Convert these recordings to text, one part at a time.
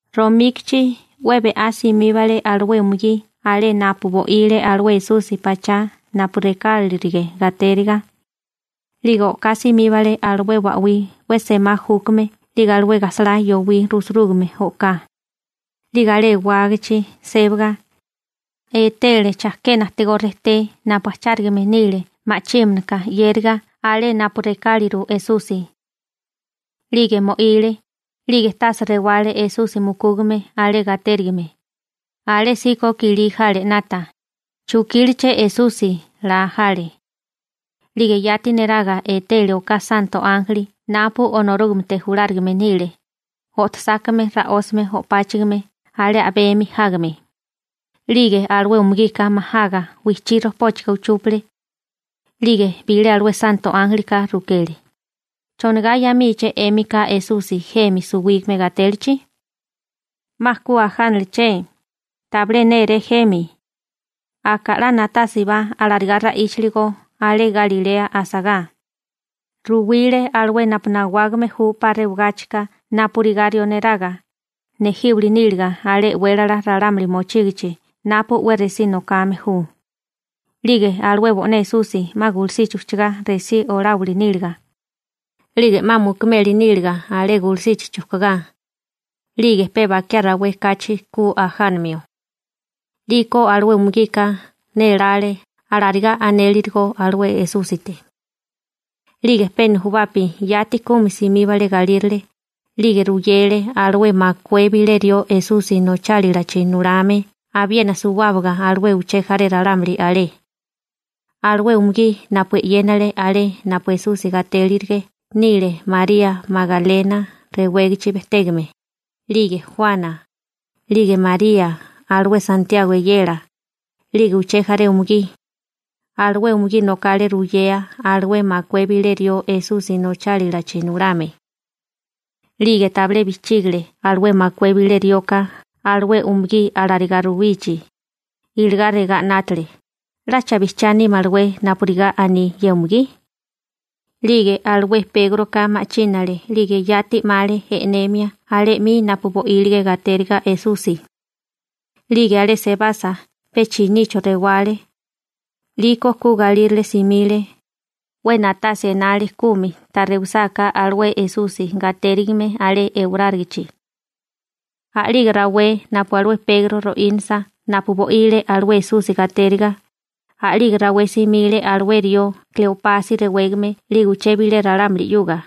Romíkichi 'we be'á simíbale alué umugí alé napu bo'ile alué Esusi pachá napu rekálirige gatériga. 'Lige o'ká simíbale alué ba'wí 'we semá júkame 'lige alué gajsalá yowí rusurúgame o'ká. 'Lige alé ewágachi sébaga, etele chajkena ajtigó rejté napu ajchárigame nile ma'chímanaka 'yériga alé napu rekáliru Esusi. 'Lige mo'ile, 'lige tase rewale Esusi mukúgame alé gatérigime. Alésíko kilí jale 'nata: «¿Chukíleché Esusi?» laa jale. 'Lige yati neraga etele oká santo ánjeli napu Onorúgamete julárigame nile, o'tosákame ra'ósame o'páchigime alé a'bemi jágame. 'Lige alué umugika majaga wijchí rojpóchaga uchúpale. 'Lige bilé alué santo ánjelika rukele: ―¿Chonigá 'yamíché 'émika Esusi jemi suwígame gatélachi? ¡'Ma ku ajánaleché, tabilé néré jemi! Aka 'la na'tásibá alarigá ra'íchaligo alé Galilea asagá. Ruwile alué napu nawágame ju 'pa rewagáchika napurigá rió neraga, nejíwili níliga alé e'wélala ralámuli mochígichi napu 'we resí nokame ju, 'lige alué bo'né Esusi 'ma gulusichi ujchagá resí oláwili níliga, 'lige 'ma mukumeli níliga alé gulusichi chujkugá, 'lige pe bakiá rawé kachi ku ajánamio. 'Liko alué umugika nélále alarigá anélirigo alué Esúsite. 'Lige pe nujubapi yati kumi simíbale galírale, 'lige ruyele alué makué bilé rió Esusi nochálilachi nulame abiena suwábaga alué uché jaré ralámuli alé. Alué umugí napu e'yénale alé napu Esusi gatélirige nile María Magalena rewégachi bejtégame, 'lige Juana, 'lige María alué Santiago eyela, 'lige uché jaré umugí. Alué umugí nokale ruyea alué makué bilé rió Esusi nochálalachi nulame. 'Lige tabilé bijchígile alué makué bilé rioka alué umugí alarigá ruwichi, iligá regá 'nátale: «¿'Lacha bijchiá nímalawé napurigá aní ye umugí?» 'Lige alué Pégroka ma'chínale 'lige yati 'male e'nemia alé 'mi napu bo'ílige gatériga Esusi. 'Lige alé sebasa pe chinicho rewale, 'liko ku galírale simile, 'we na'tasia enale kumi ta rewisáká alué Esusi gatérigime alé ewarárigichi. A'lige rawé napu alué Pegro ro'ínasa napu bo'ile alué Esusi gatériga, a'lige rawé simile alué rió Kleopasi rewégame 'lige uché bilé ralámuli 'yuga,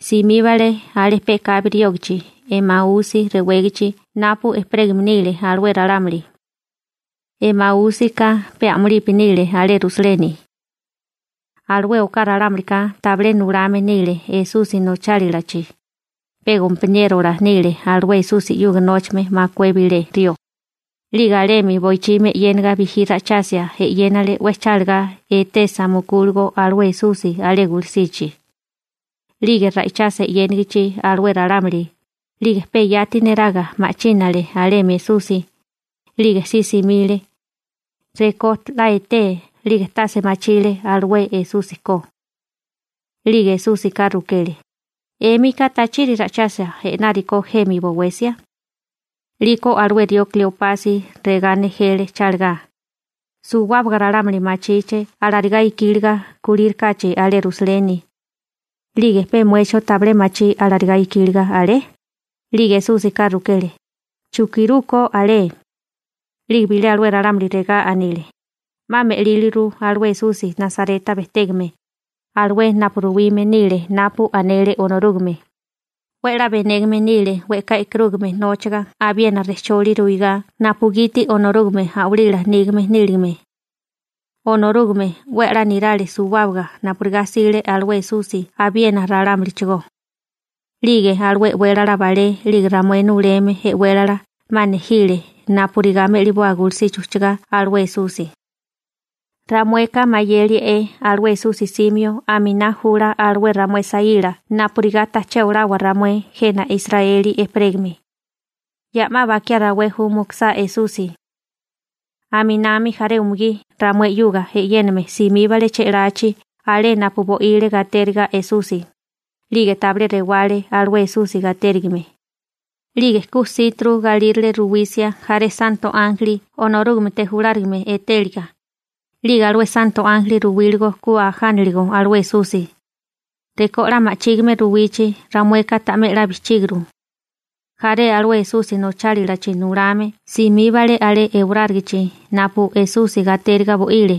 simíbale alé pe'kabi riógachi Emausi rewégachi napu ejperégame nile alué ralámuli. Emaúsika pe a'mulipi nile alé Rusaleni. Alué oká ralámulika tabilé nulame nile Esusi nochálilachi, pe gompaniérola nile alué Esusi 'yuga nóchame makué bilé rió. 'Lige alemi boichimi e'yénaga bijí ra'ichasia e'yénale 'we chálagá etesa mukúligo alué Esusi alé gulusichi. 'Lige ra'ichasia e'yénigichi alué ralámuli, 'lige pe yati neraga ma'chínale alemi Esusi, 'lige si simile. Rekó 'la etee 'lige tase machile alué Esusi ko. 'Lige Esúsika rukele: ―¿'Émika tachiri ra'ichasia i'nárikó jemi bowesia? 'Liko alué rió Kleopasi regá nejele chálagá: ―Suwábaga ralámuli machíché alarigá ikíliga kulírikáchi alé Rusaleni. 'Lige ¿pe muecho tabilé machí alarigá ikíliga alé? 'Lige Esúsika rukele: ―¿Chukirú ko alé? 'Lige bilé alué ralámulika regá anile: ―'Ma me'líliru alué Esusi Nasareta bejtégame, alué napu ruwime nile napu anele Onorúgame. 'We 'la benégame nile we'ká e'karúgame nóchaga abiena rejcholi ruigá napugiti Onorúgame a'walila nígame níligame. Onorúgame 'we a'lá nirale suwábaga napurigá 'sile alué Esusi abiena ralámulichigó. 'Lige alué e'wélala balé 'lige ramué nuleme e'wélala 'ma nejile napurigá me'liboa gulusichi ujchagá alué Esusi. Ramueka mayelie alué Esusi 'simio aminá jula alué ramué saíla napurigá taché olawa ramué jena Israeli ejperégame. Ya 'ma bakiá rawé ju mukusá Esusi. Aminami jaré umugí ramué 'yuga e'yéname simíbale che'lachi alé napu bo'ile gatériga Esusi, 'lige tabilé rewale alué Esusi gatérigime. 'Lige ku jsíturu galírale ruwisia jaré santo ánjeli Onorúgamete julárigame etéliga, 'lige alué santo ánjeli ruwíligo ku ajániligo alué Esusi. Rekó 'la ma'chígime ruwichi ramueka ta'mé 'la bijchíguru. Jaré alué Esusi nochálilachi nulame simíbale alé ewarárigichi napu Esusi gatériga bo'ile,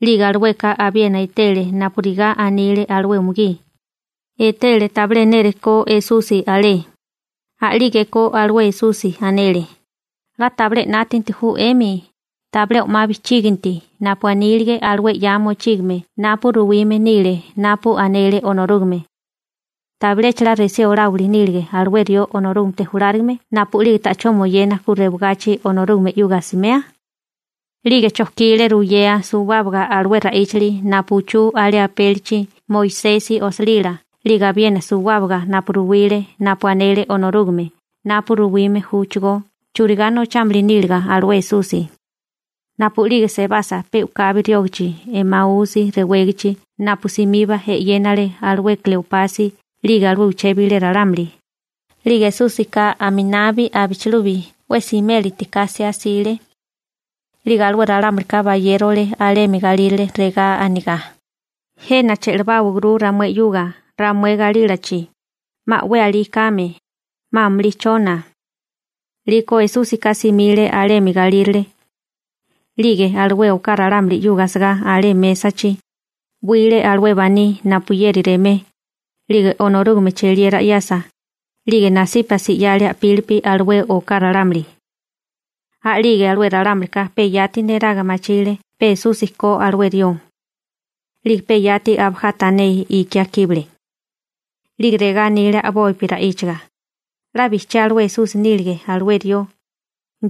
'lige alueka abiena etele napurigá anile alué umugí, etele tabilé nérekó Esusi alé. A'lígeko alué Esusi anele: ―¡'La tabilé 'nátanti ju 'emi, tabilé o'má bijchíginti napu anílige alué 'ya mochígame napu ruwime nile napu anele Onorúgame! ¿Tabilecha resí oláwili nílige alué rió Onorúgamete julárigame napu'lige ta'chó moyena ku rewagachi Onorúgame 'yuga asimea? 'Lige chojkile ruyea suwábaga alué ra'íchali napu uchú alé apélichi Moisesi osilila 'lige abiena suwábaga napu ruwile napu anele Onorúgame napu ruwime júchigó churigá nochámili níliga alué Esusi. Napu'lige sebasa pe u'kabi riógachi Emausi rewégichi napu simiba e'yénale alué Kleopasi 'lige alué uché bilé ralámuli, 'lige Esúsika aminabi abichilubi 'we siméliti ka 'siá 'sile. 'Lige alué ralámulika bayérole alemi galírale, regá anegá: ―Jena che'lebáwaguru ramué 'yuga ramué galílachi, 'ma 'we alí kame, 'ma amulí chona. 'Liko Esúsika simile alemi galírale. 'Lige alué oká ralámuli 'yuga asagá alé mésachi, 'wile alué baní napuyeri remé, 'lige Onorúgame cheliera 'yasa, 'lige nasípasi 'yale a'pílipi alué oká ralámuli. A'lige alué ralámulika pe yati neraga machile pe Esusi ko alué rió. 'Lige pe yati abajá tané ikiá kíbale. 'Lige regá anile a'bopi ra'íchaga: ―'La bijchiá alué Esusi nílige alué rió,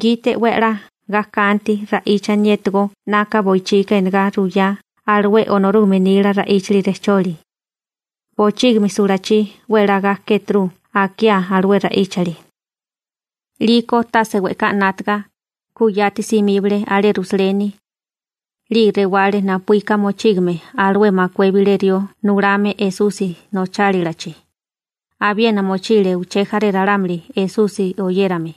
gite 'we a'lá ga kanti ra'íchaniétigó 'naka boichika enegá ruyá alué Onorúgame nila ra'íchali rejcholi. Bochígimi sulachí 'we a'lá ga kéturu akiá alué ra'íchali. 'Liko tase we'ká 'nátaga, ku yati simíbale alé Rusaleni. 'Lige rewale napuíka mochígame alué makué bilé rió nulame Esusi nochálalachi, abiena mochile uché jaré ralámuli Esusi oyérame.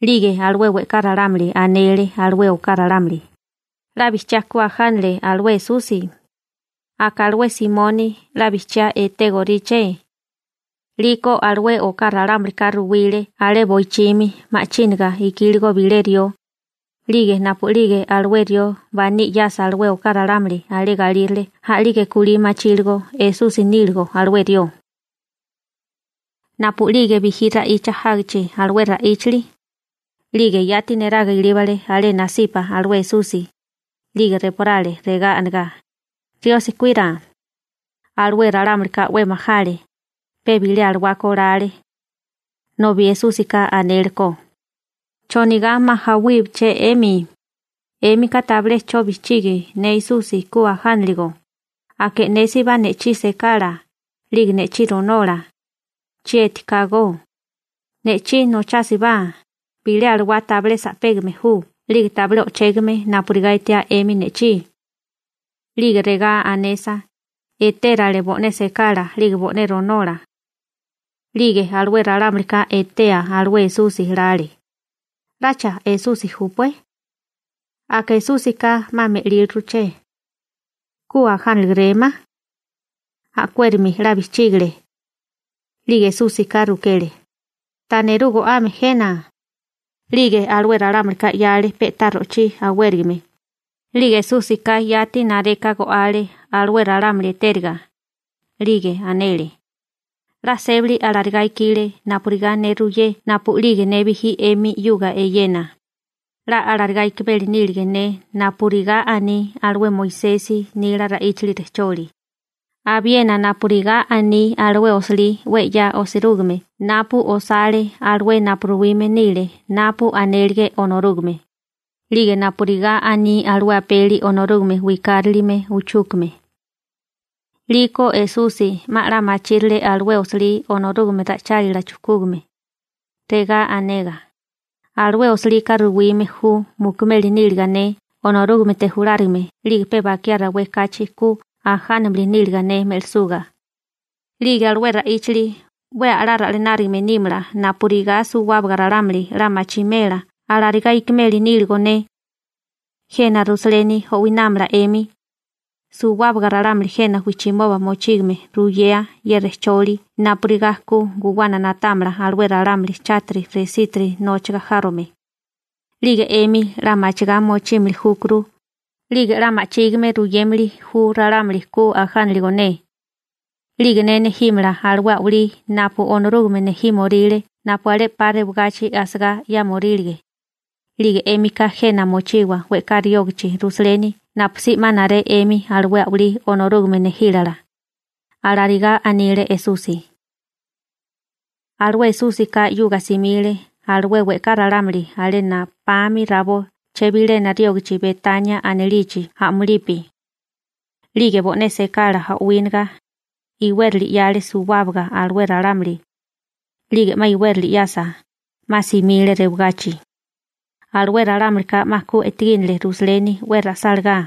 'Lige alué we'ká ralámuli anele alué oká ralámuli: ―¡'La bijchiá ku ajánale alué Esusi! Aka alué Simoni (Pegro) 'la bijchiá etégoríché. 'Liko alué oká ralámulika ruwile alé boichimi ma'chínaga ikíligo bilé rió. 'Lige napu'lige alué rió baní 'yasa alué oká ralámuli alé galírale a'lige kulí machíligo Esusi níligo alué rió. Napu'lige bijí ra'icha jágichi alué ra'íchali, 'lige yati neraga ilíbale alé nasipa alué Esusi, 'lige reporale regá anegá: ―Riosi kuira. Alué ralámulika 'we majale, pe bilé alawá ko lale. Nobi Esúsika anele ko: ―¿Chonigá majawíché 'emi? 'Émika tabilé 'cho bijchigi ne Esusi ku ajániligo. Aka e'nésibá ne'chí sekala, 'lige ne'chí ronola. Chieti ka go. Ne'chí nochásibá, bilé alawaka tabilé sa'pégame ju 'lige tabilé o'chégame napurigá etiá 'emi ne'chí. 'Lige regá anesa, etérale bo'né sekala 'lige bo'né ronola. 'Lige alué ralámulika etea alué Esusi lale: «¿'Lacha Esusi júpué? Aka Esúsika 'ma me'líliruché. ¿Ku ajánalegerémá?» A'kuérami 'la bijchígale. 'Lige Esúsika rukele: ―¿Ta nerú go'ame jena? 'Lige alué ralámulika 'yale pe'tá ro'chí awérigame, 'lige Esúsika yati nareka go'ale alué ralámuli etériga. 'Lige anele: ―'La sébali alarigá ikile napurigá ne ruiyé napu'lige ne bijí 'emi 'yuga eyena, 'la alarigá ikimeli nílige ne napurigá aní alué Moisesi nila ra'íchali rejcholi, abiena napurigá aní alué osilí 'we 'ya osirúgime napu osale alué napu ruwime nile napu anélige Onorúgame, 'lige napurigá aní alué apeli Onorúgame Wikárilime uchúkame. 'Liko Esusi 'ma 'la machírale alué osilí Onorúgame ra'ichálila chujkúgame, regá anegá: ―Alué osilika ruwime ju mukumeli níliga ne Onorúgamete julárigame 'lige pe bakiá rawé kachi ku ajánamili níliga ne me'lisuga. 'Lige alué ra'íchili 'we a'lá ra'lanárigame nímala napurigá suwábaga ralámuli 'la machimela alarigá ikimeli níligo ne. Jena Rusaleni o'winámala 'emi, suwábaga ralámuli jena wijchimoba mochígame ruyea ye rejcholi napurigá ku guwana na'támala alué ralámuli chátiri resitiri nóchaga járome. 'Lige 'emi 'la machigá mochímili júkuru, 'lige 'la ma'chígime ruyémili ju ralámuli ku ajániligo ne. 'Lige ne nejímala alué a'walí napu Onorúgame nejímoríle napu alé 'pa rewagachi asagá 'yámorílige, 'lige 'émika jena mochiwa we'ká riógachi Rusaleni napusí 'ma naré 'emi alué a'walí Onorúgame nejílala ―alarigá anile Esusi. Alué Esúsika 'yuga simile alué we'ká ralámuli alé na'pami rabó chebilena riógachi Betania anilichi a'mulipi. 'Lige bo'né sekala o'wíniga, iwérali 'yale suwábaga alué ralámuli. 'Lige 'ma iwérali 'yasa, 'ma simile rewagachi. Alué ralámulika 'ma ku e'tegínele Rusaleni 'we ra'sálagá.